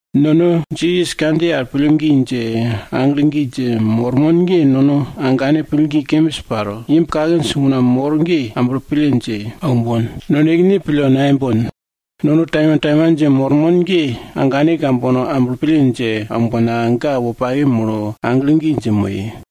Nono Jisas kandjiye al pillgi dje, aglo gi dje mormon ge, nono agane pillgi kembis paro, imb kakinj una mor ge, amblo pille dje aumbon, nonekene pille nayembon. Nono taimantaiman dje mormon ge, agane kambono amblo pille dje aumbonka, ga wopake molo, aglo gi dje moye.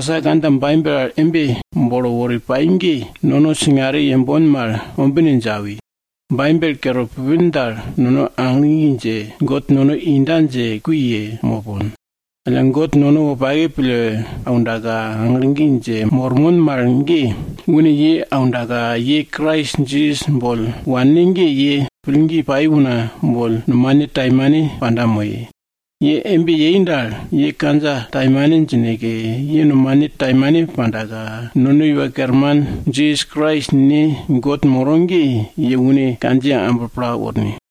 Kamasa kandja Baibel al embe bolo wori pai ge, nono singare yembon mal ombine dje awi. Baibel kere pupin dal, nono aglo gi dje, God nono inda dje kui ye mopon. Alla God nono wopake pille aundaka, aglo gi dje mormon mal ge, une ye aundaka, ye Krais Jisas boll wanne ge, ye pillgi pai una boll nomane taimane panda moye. Ye embe yei dal, ye kandja taimane djineke, ye nomane taimane pandaka, nono Iwa Kerman Jisas Krais Ne God moro ge, ye une kandjiye amblo pla worne.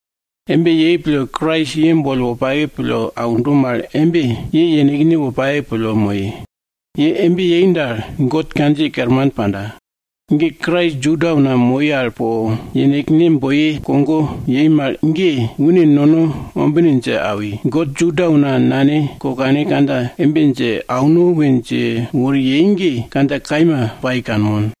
Embe yei pille Krais ye boll wopake pille aundo mal embe, ye yenekne wopake pille moye. Ye embe yei dal, God kandjiye kerman panda. Ge Krais Juda una moi al po yenekne boi kogo yei mal ge, une nono ombine dje awi, God Juda una nane kokane kandja embe dje ye auno we dje wori yei ge, kandja kaima dji kanmon.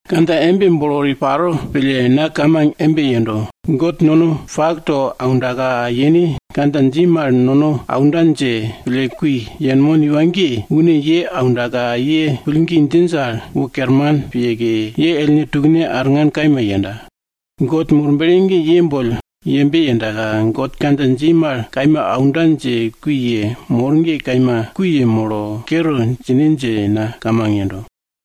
Kandja embe bolo wori paro pille na kamang embe yendo. God nono pak to aundaka yene kandja dji mal nono aunda dje pille kui yenmon iwa ge, une ye aundaka, ye pillgi djinj al, wo kerman piyeke, ye ellne tukne pakna arngan kaima yenda. God Murble ge ye boll yembe yendaka, God kandja dji mal kaima aunda dje kui yemor ge, kaima kui yemolo, kere djine dje na kamang yendo.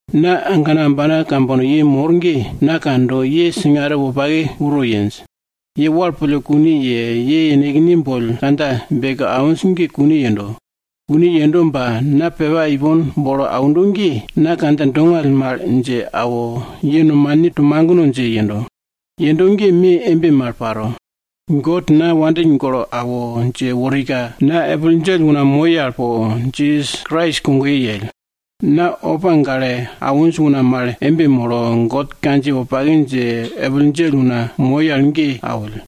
Na agana ambana kambono ye mor ge, na kando, ye singare wopake uro yenj. Ye wal pille kune ye, ye yenekne boll kandja beke awinj ge kune yendo. Kune yendo ba na pepa ipon bolo aundo ge, na kandja dongall mal dje awo, ye nomane to magno dje yendo. Yendo ge me embe mal paro. God na wopake pille awo dje worika, na epil djell una moi al po Jisas Krais kogoye yell. Na opa gale awinj una mal embe molo, God kandjiye wopake dje epil djell una moi al ge awill.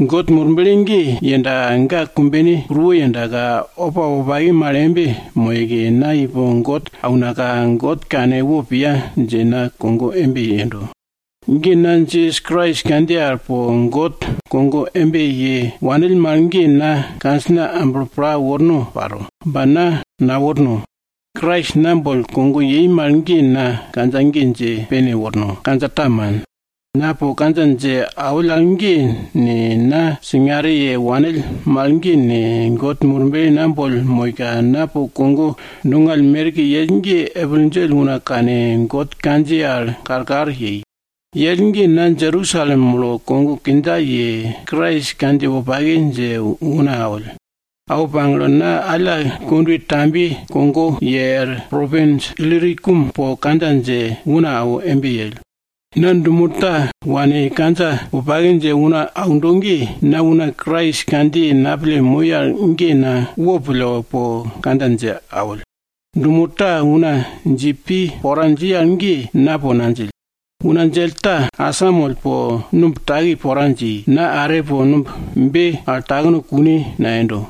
God Murble ge yendaka ga kumbene kuruwo yendaka, opa wopake mal embe moyeke, na ipo God aunaka, God kane wo piya dje na kogo embe yendo. Na Jisas Krais kandjiye al po God kogoye embe ye wanill mal ge na kandjina amblo pla worno paro, ba na naworno. Krais na boll kogo yei mal ge na kandja ge dje pene worno, kandja ta man. Na po kandja dje awill al ge ne, na singare ye wanill mal ge ne, God Murble na boll moika, na po kogo dongall merke yell ge, epil djell una kane, God kandjiye al pille karkar yei. Yell ge na Jerusalem molo kogo kindja ye, Krais kandjiye wopake dje una awill. Awo pagle, na alla kondwe tambiye kogo ye er propins Ilirikum po kandja dje una awo embe yell. Na dumo ta wane kandja wopake dje una aundo ge, na una Krais kandjiye napille moi al ge na wopille po kandja dje awill. Dumo ta una dji pi pora dji al ge, na po nadjill. Una djell ta asamoll po numb taki pora dji, na are po numb be al takno kune nayendo.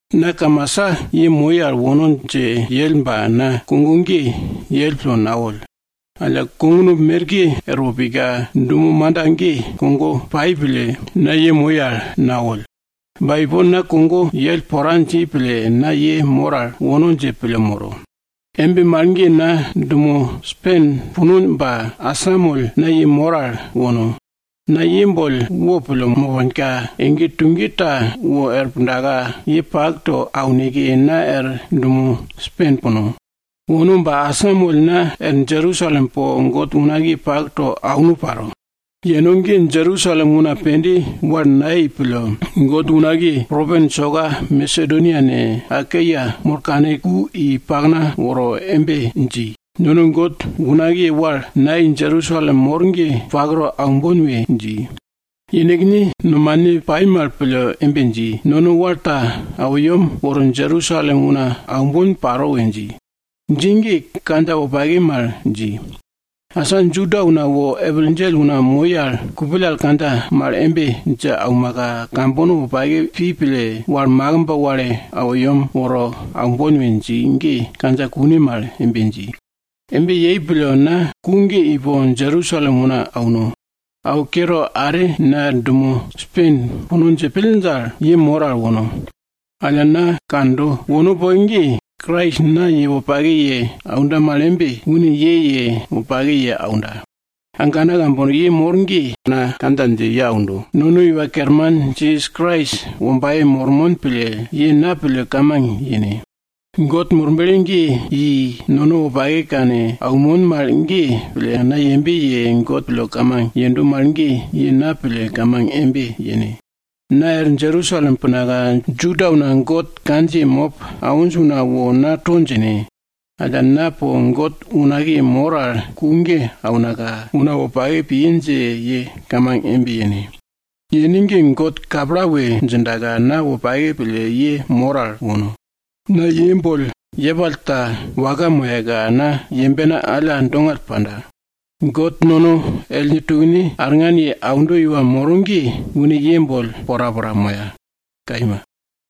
Na kamasa ye moi al wono dje yell ba na kogo ge yell pille nawoll. Alla kognumb merke erwo pika, dumo manda ge kogo pai pille, na ye moi al nawoll. Ba ipon na kogo yell pora dji pille, na ye mor al wono dje pille moro. Embe mal ge na dumo Spen puno ba asamoll na ye mor al wono. Na ye boll wopille moponka, ege tuge ta wor pundaka, ye pak to auneke, na er dumo Spen puno. Wono ba asamoll na er Jerusalem po God unakiye pak to auno paro. Yeno ge, Jerusalem una pende wal nayei pille, God unakiye propins soka Masedonia ne, Akaia molo kane, ku i pakna woro embe dji, nono God unakiye wal nayei Jerusalem mor ge pak to aumbon we dji. Yenekne nomane pai mal pille embe dji, nono wal ta awo yem woro Jerusalem una aumbon paro we dji. Dji ge kandja wopake mal dji. Asa Juda una wo epil djell una moi al, kupill al kandja mal embe dje aumaka, kambono wopake pi pille, wal makimb wale awo yem woro aumbon we dji ge kandja kune mal embe dji. Embe yei pille na ku ge ipo Jerusalem una auno. Awo kere, are na er dumo Spen puno dje pill dal, ye mor al wono. Alla na kando, wono poke ge, Krais na ye wopake ye aunda mal embe, une ye ye wopake ye aunda. Agana kambono ye mor ge, na kandja dje ye aundo, nono Iwa Kerman Jisas Krais wombaye mormon pille, ye na pille kamang yene. God Murble ge yei, nono wopake kane aunmon mal ge pille, na yembe ye God pille kamang yendo mal ge, ye na pille kamang embe yene. Na er Jerusalem punaka, Juda una God kandjiye mop awinj una wo na to djine. Alla na po God unakiye mor al ku ge aunaka, una wopake piye dje ye kamang embe yene. Yene ge, God kapla we djindaka, na wopake pille ye mor al wono. Na ye boll yepall ta waka moyaka, na yembena alla dongall panda. God nono ellne tukne arngan ye aundo iwa moro ge, une ye boll porapora moya, kaima.